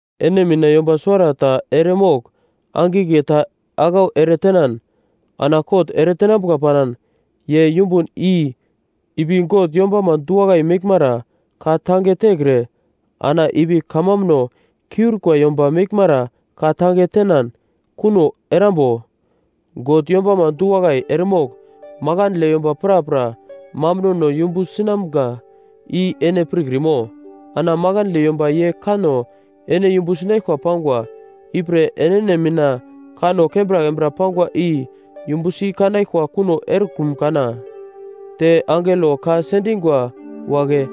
Ene mina yomba suwarata eremogl angigle ta aglau eretenan ana kot eretenambuka panan, ye yumbun i ipi God yombama du-wakai meglmara ka tange tekre ana ipi kamambuno kiurikwa yomba meglmara ka tange tenan kuno erambo? God yombama du-wakai eremogl makandle yomba prapra mambunono yumbu sinamga i ene pirkrimo? Ana makandle yomba ye kanno ene yumbu sinaglkwa pangwa, ipre enene mina kanno kembra kembra pangwa i yumbu si kanaglkwa kuno erekrum kana? Te angelo ka sendingwa wagle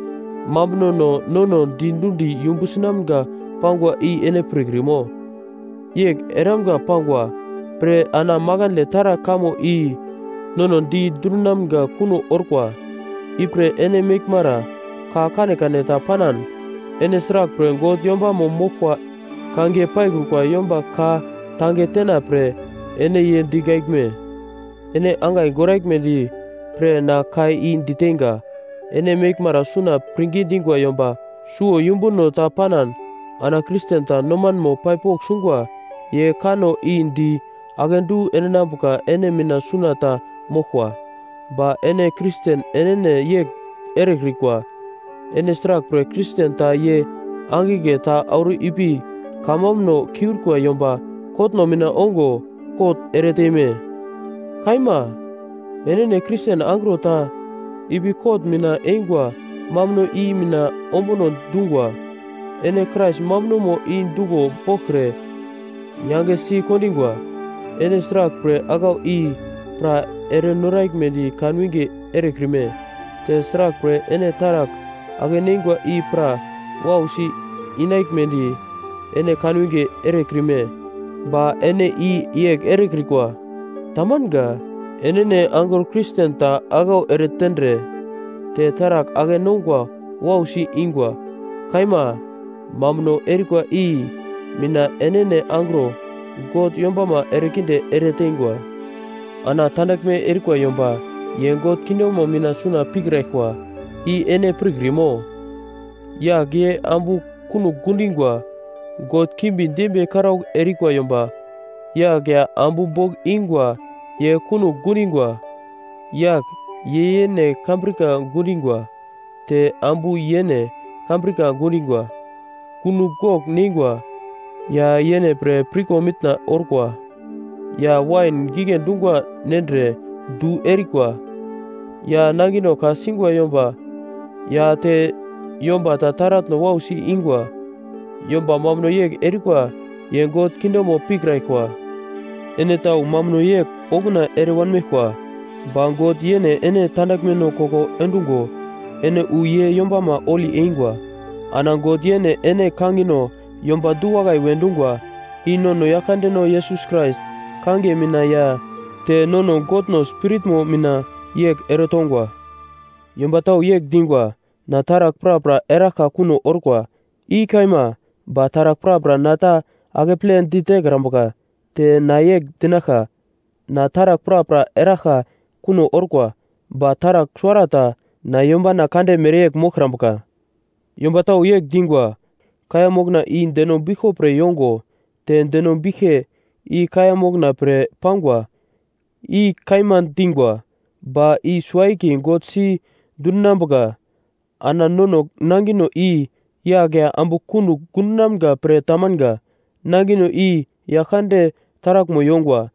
mambunono nono di dundi yumbu sinamga pangwa i ene pirkrimo? Yegl eramga pangwa pre ana makandle taragl kamo i nono di dundinamga kuno orkwa. Ipre ene meglmara ka kanekane ta panan, ene sraglpre God yombamo moglkwa kangiye paikrukwa yomba ka tange tena pre ene ye digaglme? Ene angai goraglmedi pre na ka i diteinga. Ene meglmara suna pirngi dingwa yomba suwo yumbuno ta panan ana Kristen ta nomanmo pai pogl sungwa ye kanno i di akedu endinambuka ene mina suna ta moglkwa. Ba ene Kristen enene yegl erekrikwa. Ene sraglpre Kristen ta ye angigle ta auro i pi kamambuno kiurikwa yomba kotno mina ongo kot ereteime? Kaima. Enene Kristen angro ta i pi kot mina eingwa mambuno i mina ombuno dungwa, ene Krais mambunomo i duglo boglkre yangesi kondingwa. Ene sraglpre aglau i pra ere noraglmedi kan winge erekrime? Te sraglpre ene taragl ake-neingwa i pra wausi inaglmedi ene kan winge erekrime? Ba ene i yegl erekrikwa. Tamanga. Enene angro Kristen ta aglau ere tendre te taragl ake-nongwa wausi ingwa. Kaima, mambuno erikwa i mina enene angro God yombama erekinde ereteingwa. Ana tandaglme erikwa yomba ye God kingdomo mina suna pikraglkwa, i ene pirkrimo? Yagl ye ambu kunogl gundingwa, god kimbi dembiye karaugl erikwa yomba, yagl ya ambu bogl ingwa ye kunogl gundingwa, yagl ye yene kambrika gundingwa, te ambu yene kambrika gundingwa. Kunogl gogl neingwa, ya yene pre pirko mitna orkwa, ya wain gigle dungwa nendre du erikwa, ya nangino ka-singwa yomba, ya te yomba ta taratno wausi ingwa. Yomba mambuno yegl erikwa ye God kingdomo pikraglkwa. Ene tau mambuno yegl okuna ere wanmeglkwa. Ba God yene ene tandaglmeno koko endungo ene wu ye yombamo holi eingwa. Ana God yene ene kangino yomba du-wakai we dungwa. I nono Yaglkandeno Yesus Krais kangiye mina ya te nono Godno Spiritmo mina yegl eretongwa. Yomba tau yegl dingwa, “Na taragl prapra eraglka kuno orkwa.” I kaima. Ba taragl prapra na ta akeple ditekrambuka. Te na yegl dinaglka, “Na taragl prapra eraglka kuno orkwa, ba taragl suwarata na yombana kande mereyegl moglkrambuka.” Yomba tau yegl dingwa, “Kaiya mokna i deno biglko pre yongo, te deno biglke i kaiya mokna pre pangwa.” I kaima dingwa, ba i suwo-akiye God si dundinambuka. Ana nono nangino i yagl ya ambu kunogl gundonamga pre tamanga. Nangino i Yaglkande taraglmo yongwa,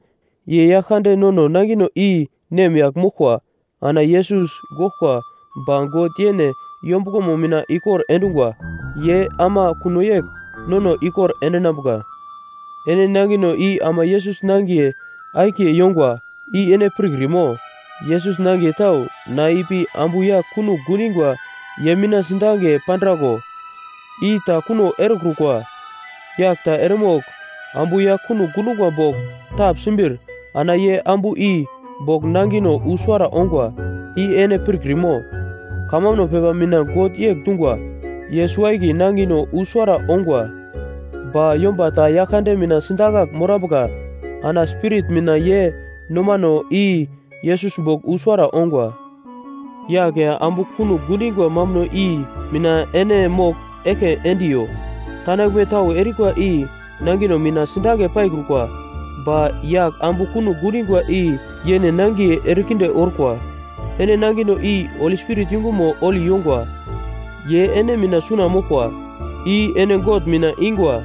ye Yaglkande nono nangino i nemyagl moglkwa. Ana Yesus goglkwa ba God yene yombuglomo mina ikor endungwa, ye ama kuno yegl nono ikor endinambuka. Ene nangino i ama Yesus nangiye akiye yongwa, i ene pirkrimo? Yesus nangiye tau na ipi ambu yagl kunogl gundingwa ye mina sidange pandraglo? I ta kuno erekrukwa. Yagl ta eremogl ambu yagl kunogl gundungwa bogl tapsimbir ana ye ambu i bogl nangino wu suwara ongwa, i ene pirkrimo? Kamambuno pepa mina God yegl dungwa, “Ye suwo-akiye nangino wu suwara ongwa.” Ba yomba ta Yaglkande mina sidakagl morambuka ana spirit mina ye nomano i Yesus bogl wu suwara ongwa. Yagl ya ambu kunogl gundingwa mambuno i mina ene mogl eglke endiyo. Tandaglme tau erikwa i nangino mina sidange paikrukwa, ba yagl ambu kunogl gundingwa i yene nangiye erekinde orkwa. Ene nangino i Holi Spirit yungumo holi yongwa, ye ene mina suna moglkwa, i ene God mina ingwa.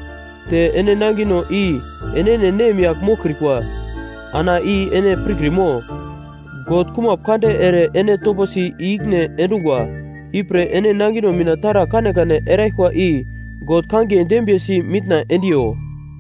Te ene nangino i enene nemyagl moglkrikwa. Ana i ene pirkrimo? God kumap kande ere ene toposi i-ikine endungwa. Ipre ene nangino mina taragl kanekane eraglkwa i God kangiye dembiyesi mitna endiyo.